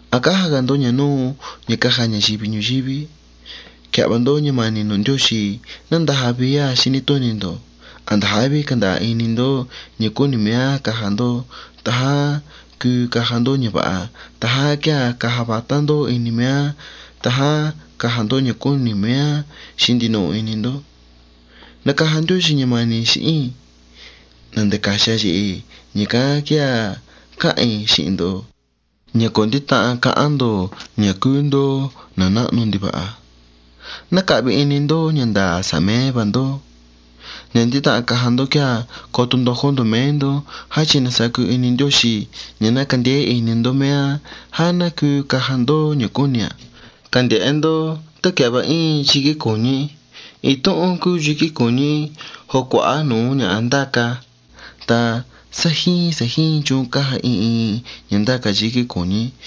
A̱ cája ga̱ ndó ña̱ núu ña̱ cája ña̱yivi ñuyíví. Quia̱hva ndó ña̱ma̱ni̱ nu̱ Ndióxi̱ ña̱ ná ndaja vií a̱ xíní túni̱ ndo̱. A̱nda̱ jáví canda̱a̱ ini ndó ña̱ cúni̱ mé á caja ndó. Ta xi̱hín ña̱ yóho cuu caja ndó ña̱ va̱ha ta cuu caja vatá ndó ini mé á ta cuu caja ndó ña̱ cúni̱ mé á xi̱hín ndinuhu ini ndó. Na̱caja Ndióxi̱ ña̱ma̱ni̱ xi̱hín i̱ tá na̱ca̱xi a ye̱he̱. Ña̱ cán quéa̱ cáha̱n i̱ xi̱hi̱n ndihi ndó ña̱ co̱ ndítahan ca̱hán ndo̱ ña̱ cúú ndó na̱ náhnu ndiva̱ha joo ná cahvi ini ndó ña̱ nda̱a̱ sa̱ha̱ mé va ndó. Ña̱ ndítahan caja ndó quéa̱ coto ndojó ndo̱ mé ndó jáchi̱ na̱sacu ini Ndióxi̱ ña̱ ná candeé ini ndó mé á já ná cuu caja ndó ña̱ cúni̱ a̱. Cande̱hé ndó tá quia̱hva íin yiquí cu̱ñu í. In túhún cúú yiquí cu̱ñu í joo cua̱há nu̱ú ña̱ha ndáca ta sa̱ jíin sa̱ jíin chuun cája in in ña̱ ndáca yiquí cu̱ñu í.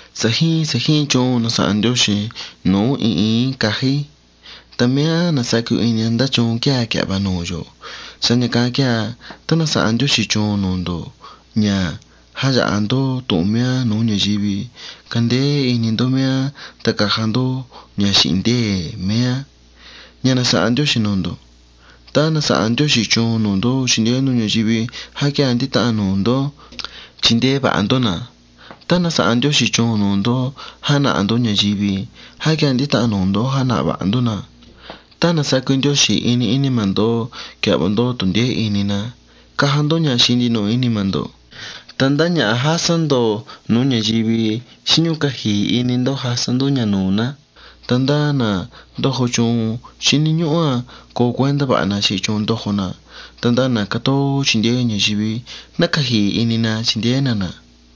Sa̱ jíin sa̱ jíin chuun na̱sa̱ha̱n Ndióxi̱ nu̱ú in in í caja í ta mé á na̱sacu ini a ndá chuun quéa̱ quia̱hva nu̱ú in in í. Sa̱há ña̱ cán quéa̱ tá na̱sa̱ha̱n Ndióxi̱ chuun nu̱ ndó jáya̱ha ndó tu̱hun mé á nu̱ú ña̱yivi, caja ndó ña̱ xi̱hi̱n ndée̱ mé á jáchi̱ cándeé ini ndó a̱. Ta tá na̱sa̱ha̱n Ndióxi̱ chuun nu̱ ndó ña̱ ná chindeé ndó ña̱yivi já quéa̱ ndítahan nu̱ ndó chindeé va̱ha ndó na̱. Ta tá na̱sa̱ha̱n Ndióxi̱ chuun nu̱ ndó jána̱ha̱ ndó ña̱yivi já quéa̱ ndítahan nu̱ ndó jána̱ha̱ va̱ha ndó na̱. Tá ta̱ na̱sacu Ndióxi̱ ini ínima̱ ndo̱ quia̱hva ndó tu̱hun ndeé ini na, caja ndó ña̱ xi̱hín ndinuhu ini ndó. Ta ndá ña̱ha jásá ndo̱ nu̱ú ña̱yivi xíní ñúhú caji̱i̱ ini ndó ja̱sá ndó ña̱. Ta ndá ndó ndójo chuun xíní ñúhú coo cuéntá va̱ha ndó xi̱hín chuun ndójo ndó. Ta ndá ndó cátóó chindeé ña̱yivi ná caji̱i̱ ini ndó chindeé ndó na̱.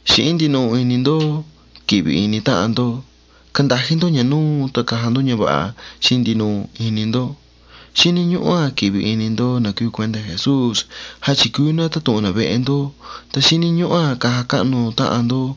Xi̱hín ndinuhu ini ndó qui̱hvi̱ ini táhan ndó. Candají ndó ña̱ núu ta caja ndó ña̱ va̱ha xi̱hín ndinuhu ini ndó. Xíní ñúhú qui̱hvi̱ ini ndó na̱ cúú cuéntá Jesús jáchi̱ cúú ná tátu̱hun na̱ vehe ndó ta caji̱i̱ ini ndó tá caja cáhnu táhan ndó.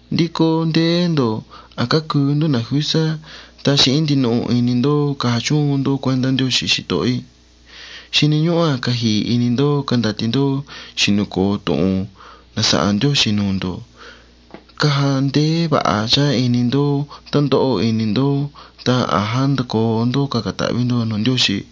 Nducú ndéé ndo̱ ta a̱ cácuu ndó na̱ ju̱sá ta xi̱hín ndinuhu ini ndó caja chúun ndó cuéntá Ndióxi̱, xitoho í. Xíní ñúhú caji̱i̱ ini ndó candatí ndó xi̱nu̱ co̱o tu̱hun na̱sa̱ha̱n Ndióxi̱ nu̱ ndo̱. Quia̱hva ndeé va̱ha ini ndó tá ndóho ini ndó ta a̱ jándacoo ndó ña̱ ca̱ca̱ ta̱hví ndo̱ nu̱ Ndióxi̱.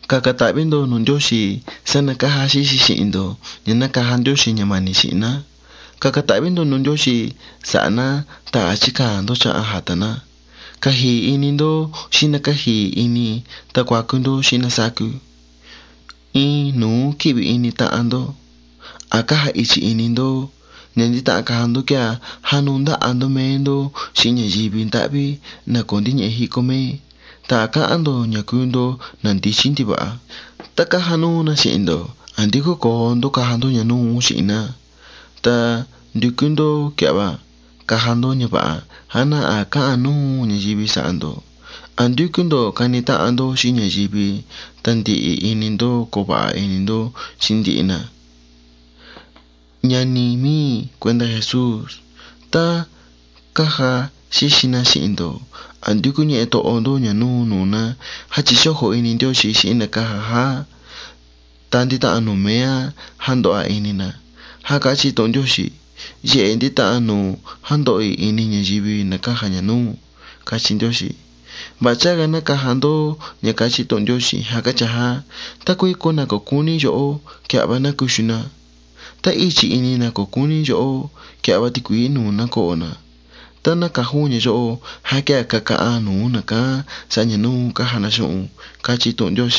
Ca̱ca̱ ta̱hví ndo̱ nu̱ Ndióxi̱ sa̱há na̱ cája xíxi xi̱hi̱n ndo̱ ña̱ ná caja Ndióxi̱ ña̱ma̱ni̱ xi̱hi̱n ná. Ca̱ca̱ ta̱hví ndo̱ nu̱ Ndióxi̱ sa̱ha̱ ná ta a̱ chíca̱a̱n ndó cháhan ja̱ta̱ ná. Caji̱i̱ ini ndó xi̱hín na̱ cáji̱i̱ ini ta cuacu ndó xi̱hín na̱ sácu. In nu̱ú qui̱hvi̱ ini táhan ndó. A̱ cája i̱chi̱ ini ndó. Ña̱ ndítahan caja ndó quéa̱ jánuu ndáha̱ ndó mé ndó xi̱hín ña̱yivi ndáhví, na̱ co̱ ndíñehe jícó mé. Ta a̱ cáhán ndo̱ ña̱ cúú ndó na̱ ndíchí ndiva̱ha. Tá cája núu na xi̱hi̱n ndó, a̱ ndícó co̱o ndó caja ndó ña̱ núu xi̱hi̱n ná. Joo nducú ndó quia̱hva caja ndó ña̱ va̱ha já ná a̱ cáha̱n núu ña̱yivi sa̱ha̱ ndo̱. A̱ ndúcú ndo̱ cani táhan ndó xi̱hín ña̱yivi ta ndi̱hi̱ ini ndó coo va̱ha ndó xi̱hín ndihi na. Ña̱ni mí i̱, na̱ cúú cuéntá Jesús. Tá cája xíxi na xi̱hi̱n ndo̱ a̱ ndúcú ñehe toho ndó ña̱ núu nu̱ ná jáchi̱ co̱jo̱ ini Ndióxi̱ xi̱hín na̱ cája já ta ndítahan nu̱ mé á jándoho a ini na. Já cáchí tu̱hun Ndióxi̱: “Ye̱he̱ ndítahan nu̱ú jándoho i̱ ini ña̱yivi, na̱ cája ña̱ núu”, cáchí Ndióxi̱. Va̱ha chága̱ ná caja ndó ña̱ cáchí tu̱hun Ndióxi̱: “Tá cuíco ña̱yivi, na̱ co̱ cúní ndo̱hó quia̱hva ndó ná cuxu na. Ta tá i̱chi̱ ini na̱ co̱ cúní ndo̱hó quia̱hva ndó ti̱cui̱í nu̱ ná coho na. Tá ná caja ndó ña̱ yóho já quéa̱ cacahan nu̱ú na̱ cán sa̱há ña̱ núu cája na xi̱hi̱n ndó.”